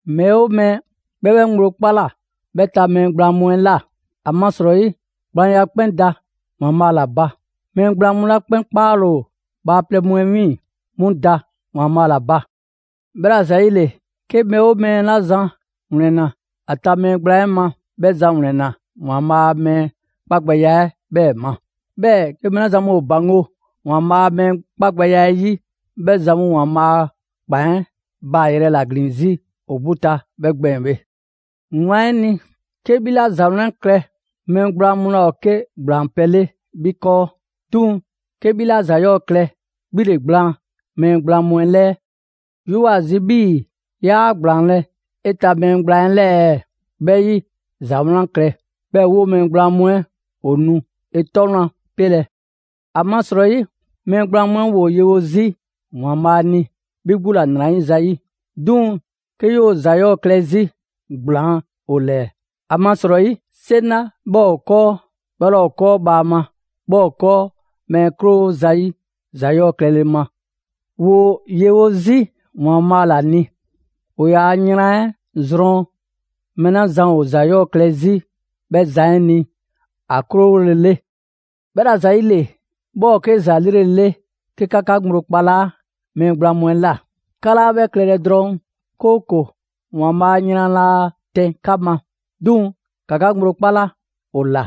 Mɛɛ 'oo mɛɛ, 'bhɛ 'bhɛ ŋgblo 'kpala 'bhɛ ta mɛɛ gblaan mu 'ɛ ꞊la. ‑Amasrɔyi gblaanya 'kpɛn da ‑Waanbhaa' ‑la ba. Mɛɛ gblaan mu 'la 'kpaale‑ ‑o bhaaplɛŋ mu 'ɛ 'wiiŋ‑, 'mu da ‑Waanbhaa' ‑la ba. 'Bhɛla‑ ‑zayile, 'ke mɛɛ 'oo mɛɛ 'la zan ‑wlɛnna ‑a ta mɛɛ gblaan 'ɛ ma, 'bhɛ zan ‑wlɛnna‑ ‑Waanbhaa' a mɛɛ 'kpagbɛya 'ɛ 'bhɛɛ‑ ma. 'Bhɛɛ‑ 'ke mɛɛ 'la zan mu ‑o ‑baŋgo' ‑Waanbhaa' a mɛɛ 'kpagbɛya 'ɛ 'yi, 'bhɛ zan mu ‑Waanbhaa' a ‑kpan 'ɛ baa‑ yrɛ ‑la ‑glin 'zi ‑o 'gbu ta 'bhɛ gbɛɛn‑ bhe. Wlan 'ɛ ni, 'ke 'bhi 'la ‑za 'wlan klɛ, mɛɛ gblaan mu laa ‑o 'ke ‑gblaan pɛ 'le 'bhi 'kɔɔ; 'duŋ‑ 'ke 'bhi 'la ‑za 'yɔɔ‑ klɛ, 'bhi ‑le gblaan mɛɛ gblaan mu 'ɛ ‑lɛɛ. 'Yoo‑ ‑a zi 'bhii‑ 'yaa ‑gblaanlɛ' 'e ta mɛɛ gblaan 'ɛ 'lɛɛ ɛɛ? 'Bhɛ 'yi, ‑za 'wlan klɛ, 'bhɛɛ‑ 'woo‑ mɛɛ gblaan mu 'ɛ ‑o nu 'e 'tɔ wlan pelɛ. ‑Amasrɔyi mɛɛ gblaan mu 'ɛ ‑woo yewo 'zi ‑Waanbhaa' ni 'bhi 'gbu ‑la ‑nrayiza 'yi. 'Duŋ‑ 'ke 'yoo‑ ‑za 'yɔɔ‑ klɛ 'zi, gblaan ‑o ‑lɛɛ. ‑Amasrɔyi 'seŋ 'la 'bhɛ ‑o 'kɔɔ, 'bhɛ 'laa ‑o ‑o 'kɔɔ bhaama; 'bhɛ ‑o 'kɔɔ mɛɛ 'krowo zayi' ‑za 'yɔɔ‑ klɛle ma. ‑Woo yewo 'zi ‑Waanbhaa' ‑la ni; ‑o ‑yaa' yran 'ɛ zrɔn mɛɛ 'la zan ‑o ‑za 'yɔɔ‑ klɛ 'zi 'bhɛ zan 'ɛ ni ‑a 'krowolele. 'Bhɛla‑ ‑zayile, 'bhɛ ‑o 'ke ‑za 'lrele‑ 'le 'ke 'ka 'ka ŋgblo 'kpalaa mɛɛ gblaan mu 'ɛ ꞊la. 'Ka 'laa 'bhɛ klɛlɛ drɔŋ, 'kooko‑ ‑Waanbhaa a yran laa tɛn 'ka ma. 'Duŋ‑ ‑ka 'ka ŋgblo 'kpala ‑o ꞊la,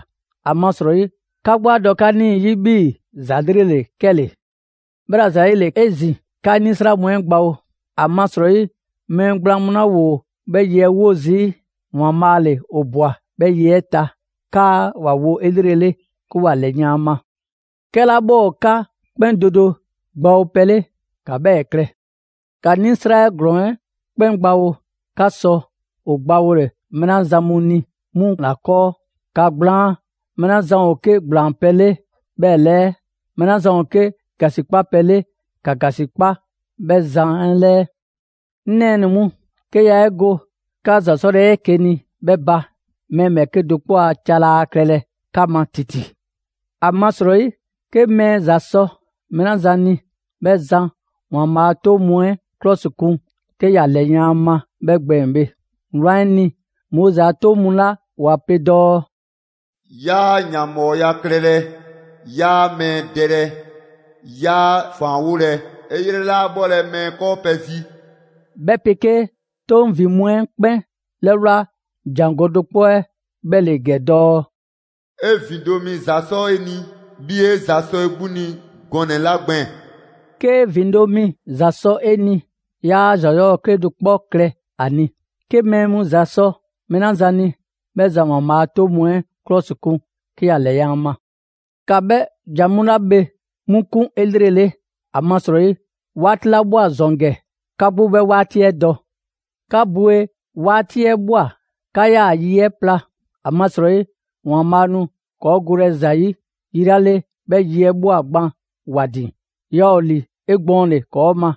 ‑amasrɔyi 'ka 'gbu 'a dɔ 'ka 'nii‑ 'yi 'bhii‑ ‑za 'lrele‑ ‑le 'kɛle‑. 'Bhɛla‑ ‑zayile 'ezin‑, 'ka 'nisra mu 'ɛ gbawo. ‑Amasrɔyi mɛɛ gblaan mu 'la ‑woo 'bhɛ ye 'ɛ 'wo zii', ‑Waanbhaa' ‑le ‑o ꞊bwa 'bhɛ ye 'ɛ ta, 'kaa ‑wa wo 'elrele 'ke ‑wa ‑lɛyan' ‑a ma. 'Kɛla 'bhɛ ‑o 'ka 'kpɛn do do gbawopɛ, ‑ka 'bhɛɛ‑ klɛ: ‑Ka 'nisra ‑glɔɔn 'ɛ 'kpɛn gbawo 'ka sɔ ‑o gbawole mɛɛ 'la zan mu ni 'mu ‑la 'kɔɔ. ‑Ka ‑gblaan mɛɛ 'la zan ‑o 'ke ‑gblaanpɛ' 'le 'bhɛ 'lɛɛ; mɛɛ 'la zan ‑o 'ke ‑gasikpa pɛ 'le, ‑ka ‑gasikpa 'bhɛ zan 'ɛ 'lɛɛ. 'Ŋ nɛɛnɛ‑ mu, 'ke yaa 'e go 'ka ‑za 'sɔle 'eke‑ ni 'ɛ 'bhɛ ba, mɛɛ ‑bhɛɛke' do 'kpɔ a ca laa klɛlɛ 'ka ma ‑titi. ‑Amasrɔyi 'ke mɛɛ ‑za sɔ mɛɛ 'la zan ni, 'bhɛ zan ‑Waanbhaa' a 'toŋ mu 'ɛ 'klɔsikun 'ke ‑ya ‑lɛyan' ‑a ma 'bhɛ gbɛɛn‑ bhe. Wlan 'ɛ ni, Moizi a 'Toŋ mu 'la ‑wa pe dɔɔ: «'Yaa ‑yanbhɔɔya klɛlɛ, 'yaa mɛɛ dɛlɛ, 'yaa ‑faanwolɛ, 'e 'yrɛ 'laa 'bhɔlɛ‑ mɛɛ 'kɔɔ pɛ zi.» 'Bhɛ 'pegee 'toŋ ‑vin mu 'ɛ 'kpɛn 'lɛwla ‑jangɔ' do 'kpɔ 'ɛ 'bhɛ ‑le ‑gɛ dɔɔ: «'E ‑vindo' mi ‑za sɔ 'e ni 'bhii‑ 'e ‑za sɔ 'e 'gbu ni gɔnɛ‑ 'la gbɛɛn‑.» 'Kee ‑vindo' mi ‑za sɔ 'e ni, yaa ‑za 'yɔɔ‑ 'kedo‑ 'kpɔ klɛ ‑a ni. 'Ke mɛɛ mu ‑za sɔ mɛɛ 'la zan ni, 'bhɛ zan ‑Waanbhaa' a 'toŋ mu 'ɛ 'klɔsikun 'ke ‑ya ‑lɛyan' ‑a ma. ‑Ka 'bhɛ ‑jan mu 'la bhe 'mu 'kun 'elrele, ‑amasrɔyi 'waati 'la ꞊bhwa ‑zɔn ‑gɛ, 'ka 'gbu 'bhɛ 'waati 'ɛ dɔ. 'Ka bwe 'waati 'ɛ ꞊bhwa 'kaa‑ yi 'ɛ pla, ‑amasrɔyi ‑Waanbhaa' nu ‑kɔɔ' golɛ ‑za 'yi yi 'la 'le 'bhɛ yi 'ɛ ꞊bhwa gban ‑wa ‑din, yaa ‑o ‑li 'egbɔɔnle ‑kɔɔ' ma,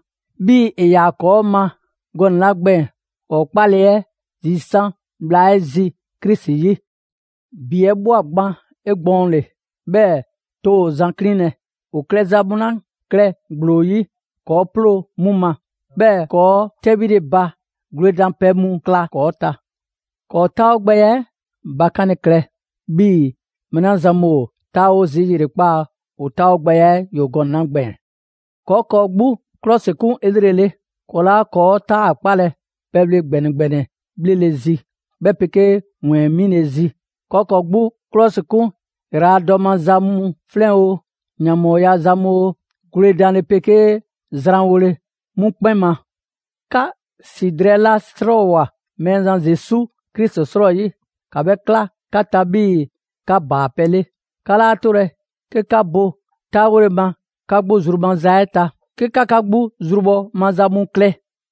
'bhii‑ ‑e ‑yaa ‑kɔɔ' ma gɔnɛ‑ 'la gbɛɛn‑ ‑kɔɔ' 'kpale‑ 'ɛ zisan' bhla 'ɛ zi Krisi 'yi. ‑Bi 'ɛ ꞊bhwa gban 'egbɔɔnle, 'bhɛɛ‑ too ‑o zan 'klinlɛ‑. ‑O klɛza mu 'la klɛ ‑gblo 'yi, ‑kɔɔ' 'ploo‑ 'mu ma; 'bhɛɛ‑ ‑kɔɔ' 'tɛbhile ba gwledanpɛ mu 'kla ‑kɔɔ' ta. ‑Kɔɔ' 'taawogbɛya 'ɛ bakanle klɛ 'bhii‑ mɛɛ 'la zan mu ‑o 'taawo zii' ‑yrekpaa' ‑o 'taawogbɛya 'ɛ ‑yoo gɔnɛ‑ 'la gbɛɛn‑. ‑Kɔɔ' ‑kɔɔ' 'gbu 'klɔsikun 'elrele, ‑kɔɔ' 'laa ‑kɔɔ' 'taakpalɛ pɛbhle ‑gbɛnɛ ‑gbɛnɛ bhlele zi, 'bhɛ 'pegee ‑wɛɛn 'mile‑ zi. ‑Kɔɔ' ‑kɔɔ' 'gbu 'klɔsikun ‑yraladɔ maza mu 'flɛn oo, ‑yanbhɔɔya za mu oo, gwledanle 'pegee zranwole, 'mu 'kpɛn ma. 'Ka ‑si drɛɛ 'la 'srɔɔwoa꞊ Mɛɛzan Zesu Krisi 'srɔyi, ‑ka 'bhɛ 'kla 'ka ta 'bhii‑ 'ka ‑baapɛ' 'le. 'Ka 'laa 'tolɛ‑ 'ke 'ka bo 'taawole ma 'ka 'gbu zru maza 'ɛ ta, 'ke 'ka 'ka 'gbu zrubhɔ maza mu klɛ.